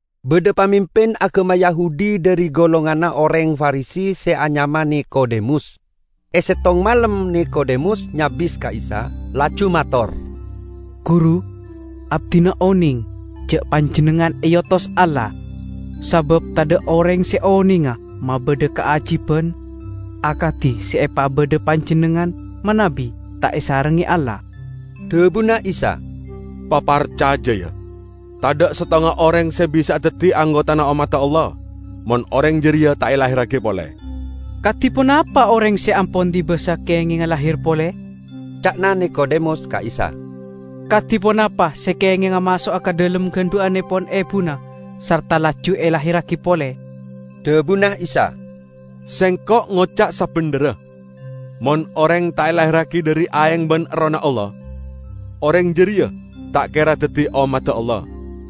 Badha pamimpin agama Yahudi dhari golonganna oreng Farisi se anyama Nikodemus. E settong malem Nikodemus nyabis ka Isa, laju mator, "Guru, abdina oneng ja' Panjennengngan eotos Allah. Sabab tadha' oreng se onenga mabadha kaajiban akadi se epabadha Panjennengngan manabi ta' esarengnge Allah." Dhabuna Isa, "Paparcaja, ya, tadha' settonga oreng se bisa'a daddi anggotana ommadda Allah mon oreng jareya ta' elahirragi pole." "Kadi ponapa oreng se ampon dibasa kengenga lahir pole?" ca'na Nikodemus ka Isa. "Kadi ponapa se kengenga maso'a ka dhalem gandhu'annepon ebuna sarta laju elahirragi pole." Dhabuna Isa, "Sengko' ngoca' sabendherra: mon oreng ta' elahirragi dhari aeng ban Errohna Allah, oreng jareya ta' kera daddi ommadda Allah.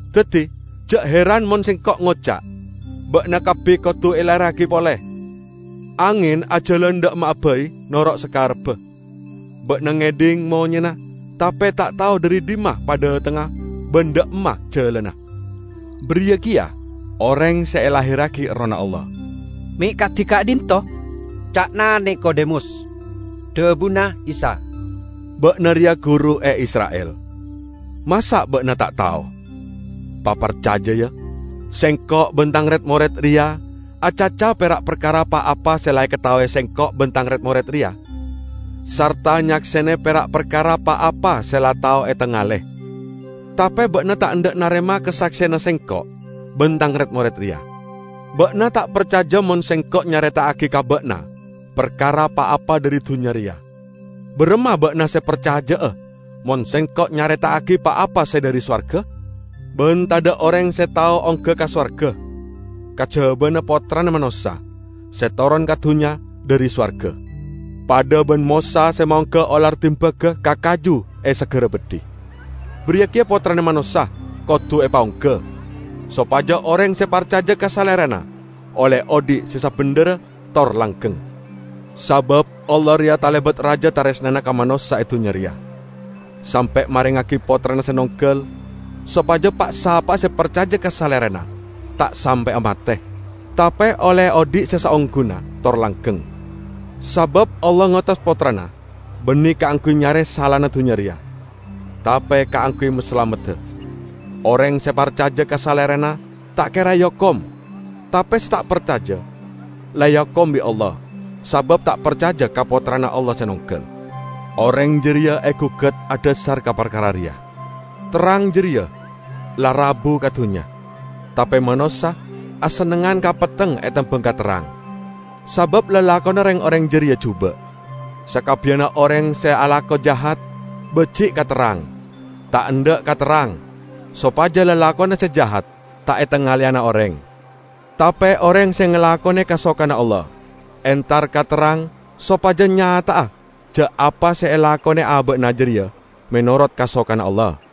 Daddi ja' heran mon Sengko' ngoca': ba'na kabbi kodu elahirragi pole. Angen ajalan dha' emma'a bai noro' sakarebba; ba'na ngedhing monyena, tape ta' tao dhari dhimma padhatengnga ban dha' emma jalanna. Bariya keya oreng se elahirragi Errohna Allah." "Me' kadi ka'dhinto'?" ca'na Nikodemus. Dhabuna Isa, "Ba'na reya guru e Isra'il. Masa' ba'na ta' tao? Paparcaja, ya: Sengko' ban Tang red-mored reya acaca pera' parkara pa-apa se la ekataowe Sengko' ban tang red-mored reya, sarta nyaksene pera' parkara pa-apa se la tao etangale; tape ba'na ta' endha' narema kasakseyanna Sengko' ban Tang red-mored reya. Ba'na ta' parcaja mon Sengko' nyareta'agi ka ba'na parkara pa-apa dhari dunnya reya; baramma ba'na se parcaja'a mon Sengko' nyareta'agi pa-apa se dhari sowarga? Ban tadha' oreng se tao ongga ka sowarga, kajabana Pottrana Manossa, se toron ka dunnya dhari sowarga. Padha ban Mosa se maongga olar dimbaga ka kaju e sagara beddhi, bariya keya Pottrana Manossa kodu epaongga, sopaja oreng se parcaja ka Salerana olle odhi' se sabendherra tor langgeng." Sabab Allah reya talebat raja taresnana ka manossa e dunnya reya, sampe' marengngagi Pottrana se nonggal, sopaja pa'-sapa'a se parcaja ka Salerana ta' sampe'a mate, tape olle odhi' se saongguna tor langgeng. Sabab Allah ngotos Pottrana banne kaangguy nyare salana dunnya reya, tape kaangguy masalamedda. Oreng se parcaja ka Salerana ta' kera eokom. Tape se ta' parcaja la eokom bi' Allah, sabab ta' parcaja ka Pottrana Allah se nonggal. Oreng jareya egugat adhasar ka parkara reya: Terrang jareya la rabu ka dunnya, tape manossa asennengngan ka petteng etembang ka terrang, sabab lalakonna reng-oreng jareya juba'. Sakabbiyanna oreng se alako jahat, baji' ka terrang, ta' endha' ka terrang, sopaja lalakonna se jahat ta' etangaleyana oreng. Tape oreng se ngalakone kasokanna Allah, entar ka terrang sopaja nyata'a ja' apa se elakone aba'na jareya menorot kasokanna Allah.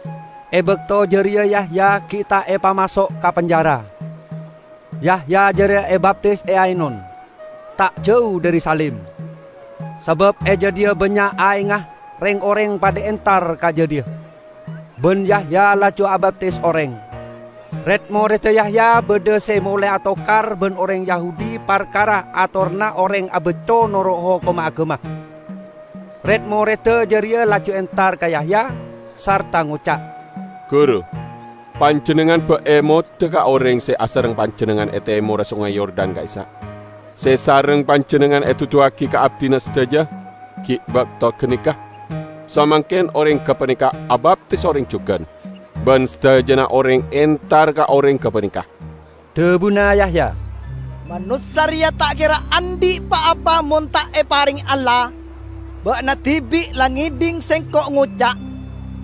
E bakto jareya Yahya gi' ta' epamaso' ka penjara. Yahya jareya abaptis e Ainon, ta' jau dhari Salim, sabab e jadhiya bannya' aengnga. Reng-oreng padha entar ka jadhiya, ban Yahya laju abaptisa oreng. Red-moredda Yahya badha se molae atokar ban oreng Yahudi parkara atoranna oreng abacco noro' hokomma agama. Red-moredda jareya laju entar ka Yahya, sarta ngoca', "Guru, panjennengngan ba' emoda ka oreng se asareng panjennengngan e temorra Songay Yordan ka'issa', se sareng panjennengngan eduduwagi ka abdina sadaja gi' bakto ganeka? Samangken oreng gapaneka abaptis oreng jugan, ban sadajana oreng entar ka oreng gapaneka!" Dhabuna Yahya, "Manossa reya ta' kera andhi' pa-apa mon ta' eparenge Allah. Ba'na dibi' la ngedhing sengko' ngoca',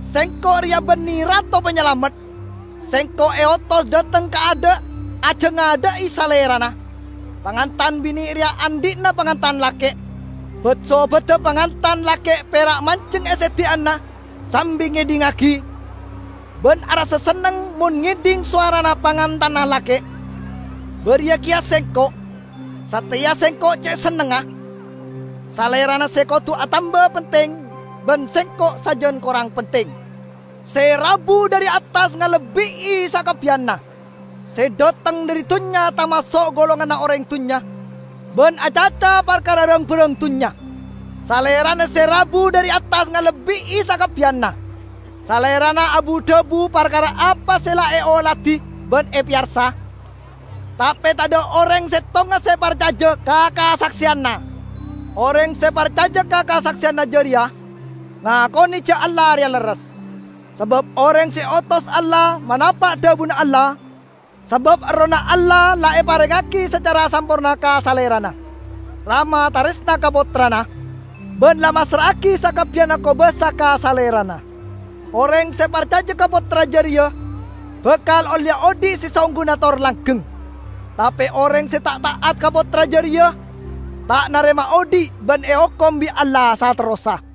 'Sengko' reya banne Rato Panyalamet. Sengko' eotos dhateng kaadha', ajangadha'i Salerana.' Pangantan bine' reya andhi'na pangantan lake'. Bat-sobadda pangantan lake' pera' manjeng e seddi'anna sambi ngedhingngagi, ban arassa senneng mon ngedhing sowarana pangantanna lake'. Bariya keya sengko'. Sateya sengko' ce' sennengnga. Salerana se kodu atamba penting, ban sengko' sajan korang penting." Se rabu dhari attas ngalebbi'i sakabbiyanna. Se dhateng dhari dunnya tamaso' golonganna oreng dunnya, ban acaca parkara rang-barang dunnya. Salerana se rabu dhari attas ngalebbi'i sakabbiyanna. Salerana abu-dhabu parkara apa se la eoladi ban epeyarsa, tape tadha' oreng settonga se parcaja ka kasakseyanna. Oreng se parcaja ka kasakseyanna jareya, ngakone ja' Allah reya lerres. Sabab oreng se eotos Allah manapa' dhabuna Allah, sabab Errohna Allah la eparengngagi sacara samporna ka Salerana. Rama taresna ka Pottrana, ban la massra'agi sakabbiyanna kobasa ka Salerana. Oreng se parcaja ka Pottra jareya bakal olleya odhi' se saongguna tor langgeng. Tape oreng se ta' ta'at ka Pottra jareya ta' narema odhi', ban eokom bi' Allah saterrossa.